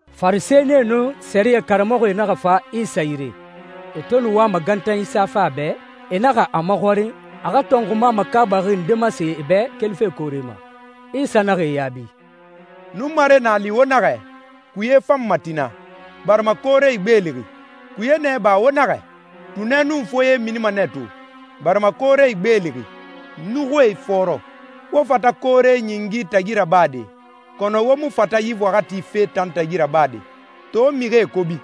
Farisɛnie nun sɛriyɛ karamɔxɔe naxa fa Isa yire. E to nu wama gantanyi safe a bɛ, e naxa a maxɔrin a xa tɔnxuma makaabaxi nde masen e bɛ kelife koore ma. Isa naxa e yaabi, «Nunmare na a li wo naxɛ, ‹Kuye fanma tina, barima koore igbeelixi.› Kuye nɛ iba wo naxɛ, ‹Tunɛ nun foye minima nɛ to, barima koore igbeelixi, nuxuie ifɔɔrɔ.› Wo fata koore ɲingi tagi rabade, kɔnɔ wo mu fata yi waxati fee tan tagi rabade. To mixie kobi,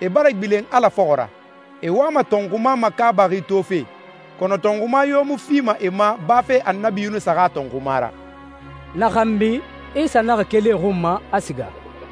e bara gbilen Ala fɔxɔ ra. E wama tɔnxuma makaabaxi tofe, kɔnɔ tɔnxuma yo mu fima e ma bafe Annabi Yunusa xa tɔnxuma ra.» Na xanbi Isa naxa keli e xun ma, a siga.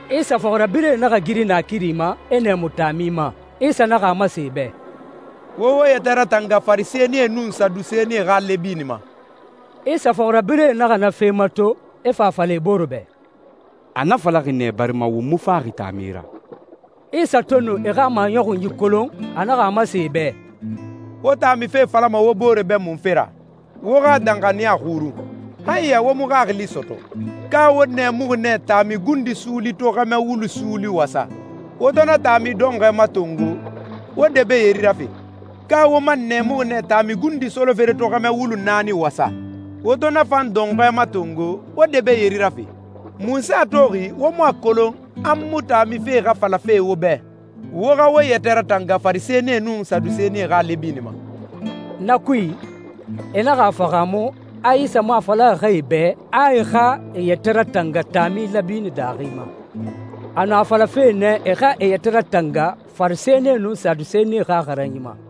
Isa fɔxirabirɛe naxa giri naakiri ma, e nɛɛmu taami ma. Isa naxa a masen e bɛ, «Wo wo yɛtɛ ratanga Farisɛnie nun Sadusenie xa lɛbini ma.» Isa fɔxirabirɛe naxa na fe mato, e fa a fala e bore bɛ, «A na falaxi nɛ barima won mu faxi taami ra.» Isa to nu e xa maɲɔxunyi kolon, a naxa a masen e bɛ, «Wo taami fe falama wo bore bɛ munfe ra? Wo xa danxaniya xurun. Han ya wo mu xaxili sɔtɔ? Ka wo nɛɛmuxi nɛ taami gundi suuli to xɛmɛ wulu suuli wasa? Wo to na taami dɔnxɔɛ matongo, wo debee yeri rafe? Ka wo man nɛɛmuxi nɛ taami gundi solofere to xɛmɛ wulu naani wasa? Wo to na fan dɔnxɔɛ matongo, wo debee yeri rafe? Munse a toxi wo mu a kolon a n mu taami fe xa falafe wo bɛ? Wo xa wo yɛtɛ ratanga Farisɛnie nun Sadusenie xa lɛbini ma.» Na kui, e naxa a fahaamu a Isa mu a falaxi xɛ e bɛ a e xa e yɛtɛ ratanga taami lɛbini daaxi ma. A nu a falafe nɛ e xa e yɛtɛ ratanga Farisɛnie nun Sadusenie xa xaranyi ma.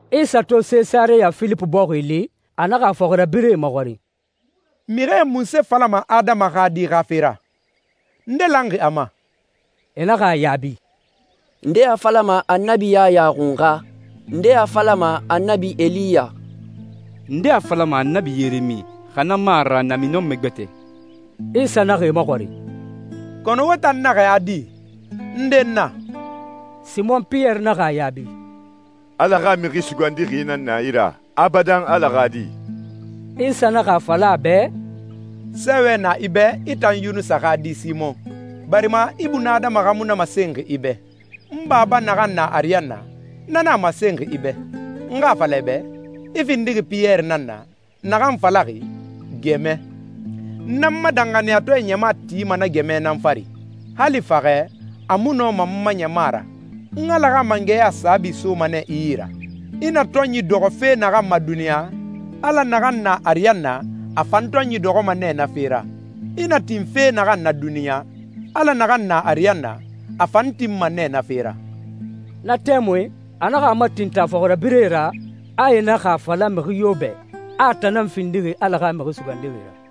Isa to Sesareya Filipi bɔxi li, a naxa a fɔxirabirɛe maxɔrin, «Mixie munse falama Adama xa Di xa fe ra? Nde lanxi a ma?» E naxa a yaabi, «Ndee a falama Annabi Yaya Xunxa. Ndee a falama Annabi Eliya. Ndee a falama Annabi Yeremi, xa na mu a ra namiɲɔnmɛ gbɛtɛ.» Isa naxa e maxɔrin, «Kɔnɔ wo tan naxɛ a di? Nde n na?» Simon Piyɛri naxa a yaabi, «Ala xa Mixi Sugandixi nan na i ra, Abadan Ala xa Di.» Isa naxa a fala a bɛ, «Sɛɛwɛ na i bɛ, i tan Yunusa xa di Simɔn, barima ibunadama xa mu na masenxi i bɛ. N Baba naxan na ariyanna, na nan a masenxi i bɛ. N xa a fala i bɛ, i findixi Piyɛri nan na, naxan falaxi ‹gɛmɛ.› N nan n ma danxaniyatɔɛ ɲama tima na gɛmɛ nan fari. Hali faxɛ, a mu nɔma n ma ɲama ra. N Ala xa mangɛya saabi soma nɛ i yi ra. I na tɔnyi dɔxɔ fe naxan ma duniɲa, Ala naxan na ariyanna, a fan tɔnyi dɔxɔma nɛ na fe ra. I na tin fe naxan na duniɲa, Ala naxan na ariyanna, a fan tinma nɛ na fe ra.» Na tɛmui a naxa a matintin a fɔxirabirɛe ra, a e naxa a fala mixi yo bɛ, a a tan nan findixi Ala xa Mixi Sugandixi ra.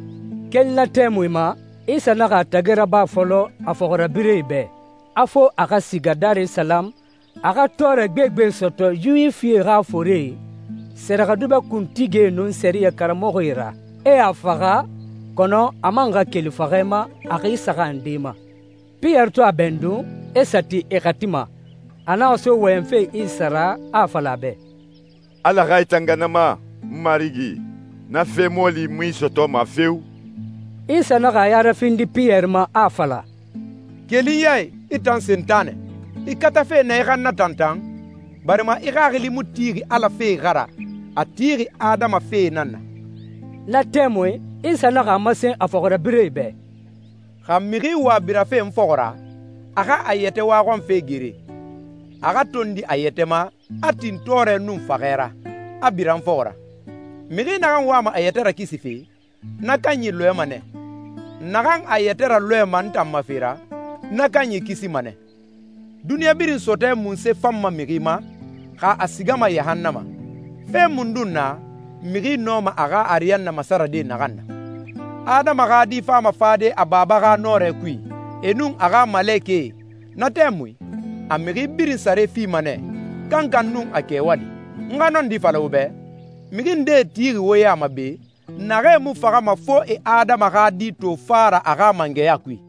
Keli na tɛmui ma, Isa naxa a tagi raba fɔlɔ a fɔxirabirɛe bɛ, a fo a xa siga Darisalamu, a xa tɔɔrɛ gbegbe sɔtɔ Yuwifie xa forie, sɛrɛxɛdubɛ kuntigie, nun sɛriyɛ karamɔxɔe ra, e a faxa, kɔnɔ a man xa keli faxɛ ma a xi saxan nde ma. Piyɛri to a bɛndun, e sa ti e xati ma, a naxa so wɔyɛnfe Isa ra, a a fala a bɛ, «Ala xa i tanga na ma, n Marigi! Na fe mɔɔli mu i sɔtɔma feo!» Isa naxa a ya rafindi Piyɛri ma, a a fala, «Keli n ya i, i tan Sentanɛ! I katafe nɛ i xa n natantan, barima i xaxili mu tixi Ala fee xa ra, a tixi adama fee nan na.» Na tɛmui Isa naxa a masen a fɔxirabirɛe bɛ, «Xa mixi wa birafe n fɔxɔ ra, a xa a yɛtɛ waxɔnfe gere, a xa tondi a yɛtɛ ma, a tin tɔɔrɛ nun faxɛ ra, a bira n fɔxɔ ra. Mixi naxan wama a yɛtɛ rakisife, na kanyi lɔɛma nɛ. Naxan a yɛtɛ ralɔɛma n tan ma fe ra, na kanyi kisima nɛ. Duniɲa birin sɔtɔɛ munse fanma mixi ma, xa a sigama yahannama? Fe mundun na, mixi nɔma a xa ariyanna masarade naxan na? Adama xa Di fama fade a Baba xa nɔrɛ kui, e nun a xa malekɛe. Na tɛmui a mixi birin sare fima nɛ, kankan nun a kɛwali. N xa nɔndi fala wo bɛ, mixi ndee tixi wo ya ma be, naxee mu faxama fo e Adama xa Di to fa ra a xa mangɛya kui.»